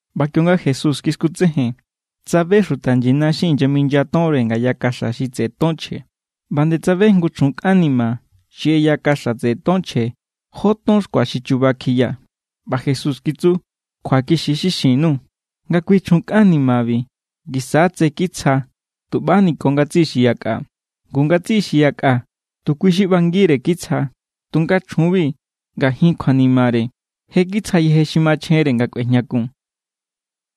ꞌBa kionga Jesús kiskutsejen, tsabe xuta nyina xi inyaminya tonre ngaya kaxa xi tseꞌe ton chje. ꞌBa nde tsabe jngu chjun kꞌan ni̱ma̱ xi ꞌeya kaxa tseꞌe ton chje jó ton xkua xi chuba kjiya. ꞌBa Jesús kitsu: —Kjuakixi= xi xin_nuu̱ nga kui chjun kꞌan nimabi ngisa= tse kitsja tuꞌbani ko ngatsiꞌi xi yakꞌa. Ngu ngatsiꞌi xi yakꞌa tu kui xi ꞌbangire kitsja, tunga chjunbi, ngajin kjuanimare, je kitsja yeje xi machjenre nga kꞌuejñakun.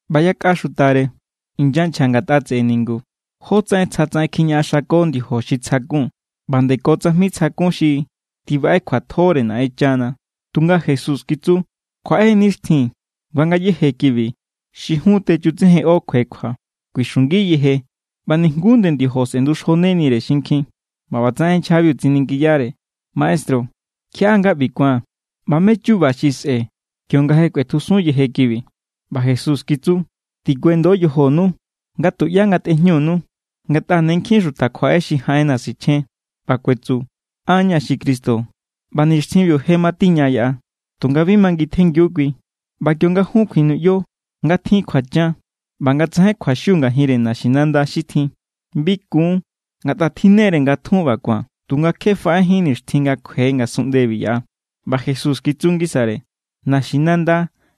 ꞌBa yakꞌa xutare inyanchja ngatꞌa tseꞌe ningu, jótsaꞌen tsjatsaꞌen kjiñaꞌaxako ndiojo xi tsjakun, ꞌba nde ko tsajmi tsjakun xi tibaꞌe kjuatjore Naꞌenchana. Tunga Jesús kitsu: —Kjuaꞌe= nixtjin nga ngayéje kibi xi jun techutsejenꞌo kjuekjua. Kuixungi yeje ꞌba nijnguú nde ndiojo sꞌe̱nduxjonenire xinkjin. ꞌBa ꞌbatsaꞌen nchjabiu tsiningiyare: —Maestru, ¿kjiaꞌá nga ꞌbi ku̱an? ꞌBa ¿mé= chuba xi sꞌe̱ kionga je kꞌuetjusun yeje kibi? ꞌBa Jesús kitsu: —Tikuendo yojonu nga tuꞌyá ngatꞌejñunu. Ngatꞌa ne nkjin xuta kjuaꞌe xi jaꞌenna̱ sichjen, ꞌba kuetsu: “An= ña̱ xi Cristo”, ꞌba: “Nixtjinbiu je matiña yaꞌa.” Tunga bi mangintjenngiu kui. ꞌBa kionga jun kjuinuꞌyo nga tjin kjuachan ꞌba nga tsajain kjuaxiu ngajinre naxinanda xi tjin, bi kun, ngatꞌa tjinne=re nga tjun ꞌba ku̱an, tunga kje faꞌejín nixtjin nga kjue ngasunꞌndebi yaꞌa. ꞌBa Jesús kitsu ngisare: —Naxinanda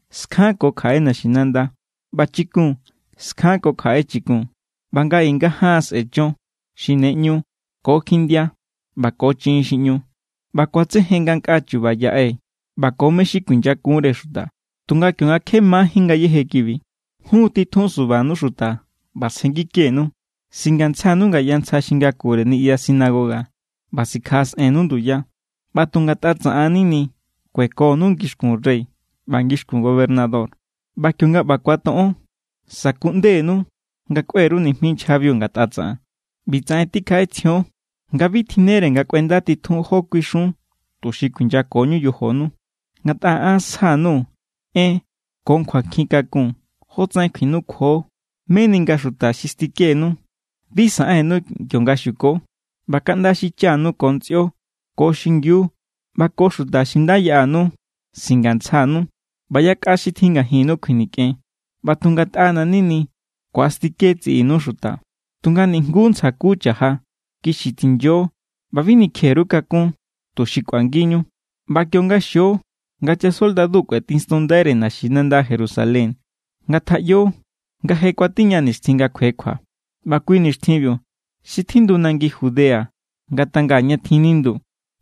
skjanko kjaꞌe naxinanda, ꞌba chikun skjanko kjaꞌe chikun. ꞌBa nga i nga jaan sꞌe̱ chon xi ne ꞌñu ko kjindia ꞌba ko chiꞌin xi ꞌñu. ꞌBa ku̱atsejen ngankꞌaa chuba yaꞌe ꞌba ko mé= xi kuinyakunre xuta. ’Tunga kionga kje majín ngayéje kibi, jun titjun subanu xuta ꞌba sjenngikenu. Singantsjanu ngaya ntsja xi ngakure niꞌya sinagoga ꞌba sikjaꞌasꞌennu nduya. ꞌBa tu ngatꞌa tsaꞌan= nini kuekonu ngixkun rey ꞌba ngixkun gobernador. ꞌBa kionga ꞌba kuatoꞌon, sa̱kuꞌndenu nga kꞌue_ru nijmi nchjabiu ngatꞌa tsaꞌan. ꞌBi tsaꞌen tikjaꞌetsjion nga bi tjinnere nga kꞌuendatitjun jó kuixun tuxi kuinyakoñu yojonu. Ngatꞌa an sja_nuu̱ en ko kjuankjin kakun jótsaꞌen kjuinukjuo meni nga xuta xi stikenu bi saꞌennu kionga xuko. ꞌBa kaꞌnda xichanu ko ntsꞌio ko xingiu ꞌba ko xuta xi nda yaꞌanu singantsjanu ꞌba yakꞌa xi tjin ngajinnu kjuinikꞌen. ꞌBa tu ngatꞌana̱= nini ku̱astike tsiꞌinu xuta. Tunga nijnguú ntsja ku cha̱ja. ¡Kixi tinyo ꞌba bi nikje_ru kakún, tuxi kꞌuangiñu! ’ꞌBa kionga xio nga chasoldadu kꞌuetinstunndaire naxinanda Jerusalén, ngatjaꞌyo nga je kuatiña nixtjin nga kjuekjua. ꞌBa kui nixtjinbiu, xi tjindu nangi Judea ngatanga ña tjin nindu,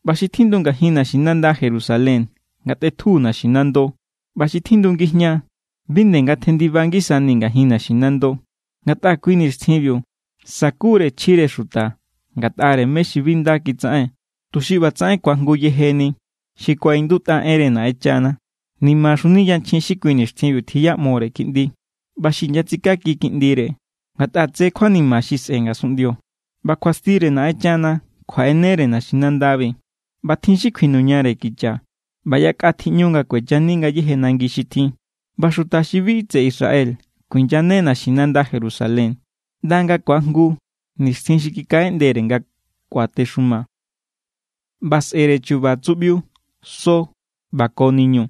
ꞌba xi tjindu ngajin naxinanda Jerusalén ngatꞌetju naxinando, ꞌba xi tjindu ngijñaa, bi nde ngatjendiba ngisani ngajin naxinando. Ngatꞌa kui nixtjinbiu sakure chjire xuta ngatꞌare mé= xi bi nda kitsaꞌen, tuxi ꞌbatsaꞌen ku̱ajngu yejeni xi kuaꞌindutꞌa enre Naꞌenchana. ¡Nimaxunini yanchjin xi kui nixtjinbiu tjiꞌyamore kiꞌndi ꞌba xi inyatsikaki kiꞌndire! Ngatꞌa tse kjuanima xi sꞌe̱ ngasunꞌndio, ꞌba kjuastire Naꞌenchana kjuaꞌenere naxinandabi. ꞌBa tjin xi kjuinuñare kicha, ꞌba yakꞌa tjiꞌñu nga kuechani ngayéje nangi xi tjin. ꞌBa xuta xi bi tseꞌe Israel kuinyane naxinanda Jerusalén ꞌnda nga̱ ku̱ajngu nixtjin xi kikaꞌeꞌndere nga kuatexuma. ’ꞌBa sꞌe̱re chu̱ba̱ tsuꞌbiu, so ꞌba ko niñu.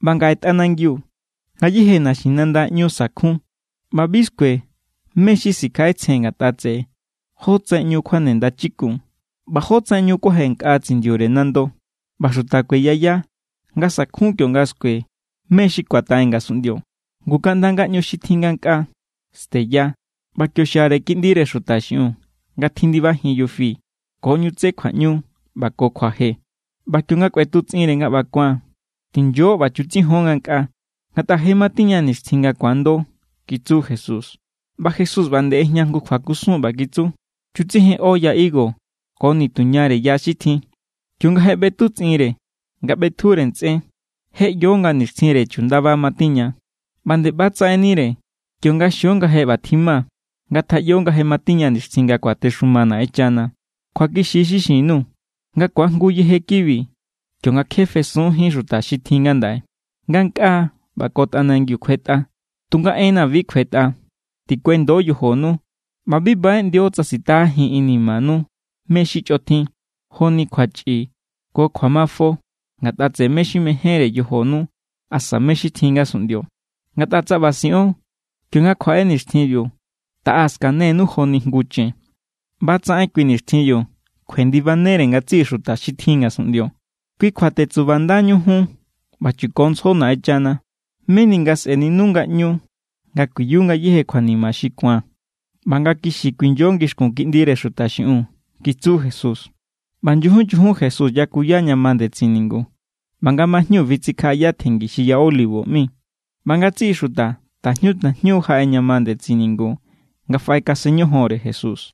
ꞌBa ngaꞌe, tꞌanangiu, ngayéje naxinanda ꞌñu sa̱kjun ꞌba bi skue mé= xi sikjaꞌetsjen ngatꞌa tseꞌe jotsaꞌen ꞌñu kjuane ndachikun ꞌba jotsaꞌen ꞌñu kuaje nkꞌa tsindiure nando. ꞌBa xuta kueyaya nga sa̱kjun kionga skue mé= xi ku̱ataꞌen ngasunꞌndio, ngu kaꞌnda ngaꞌñu xi tjin ngankꞌaa steya. ꞌBa kio xiare Kiꞌndire Xuta xiꞌiun, nga tjindibajin yufi ko ꞌñu tsé kjuaꞌñu ꞌba ko kjuaje. ꞌBa kionga kꞌuetutsꞌinre nga ꞌba ku̱an, tinyo ꞌba chutsijon ngankꞌaa, ngatꞌa je matiña nixtjin nga ku̱ando —kitsu Jesús. ꞌBa Jesús ꞌba nde ꞌejña jngu kjuakusun, ꞌba kitsu: —Chutsejenꞌo ya higo ko nituñare ya xi tjin. Kionga je ꞌbetutsꞌinre nga ꞌbetjure ntsꞌen, je ꞌyo nga nixtjinre chundaba matiña. ꞌBa nde ꞌba= tsaꞌennire kionga xio nga je ꞌba tjima, ngatjaꞌyo nga je matiña nixtjin nga kuatexuma Naꞌenchana. ’Kjuakixi= xi xin_nuu̱ nga ku̱ajngu yeje kibi kionga kje fesunjín xuta xi tjin ngandaꞌe. Ngankꞌaa ꞌba ko tꞌanangiu kjuetꞌa, tunga enna̱ bi kjuetꞌa. ’Tikuendo yojonu, ꞌba bi baꞌeꞌndio tsa sitajajin inimanu mé= xi chꞌotjin joni kjuachꞌi ko kjuamafo ngatꞌa tseꞌe mé= xi mejénre yojonu asa mé= xi tjin ngasunꞌndio. Ngatꞌa tsa ꞌba siꞌon, kionga kjuaꞌe nixtjinbiu, taꞌa skanenu joni jngu chen. ꞌBa= tsaꞌen kui nixtjinbiu kjuendibanere ngatsiꞌi xuta xi tjin ngasunꞌndio. Kui kjua tetsubandañu jun, ꞌba chukontsjo Naꞌenchana, meni nga sꞌe̱ninu ngaꞌñu nga kuiyu ngayéje kjuanima xi ku̱an, ꞌba nga kixi kuinyo ngixkun Kiꞌndire Xuta xiꞌiun —kitsu Jesús. ꞌBa nyujun nyujun Jesús yakuya ña ma ndetsin ningu, ꞌba nga majñu fitsikjaꞌaya tjenngi xi Ya Olivo ꞌmi. ꞌBa ngatsiꞌi xuta tajñu tajñu jaꞌe ña ma ndetsin ningu nga faꞌekasen ñojonre Jesús.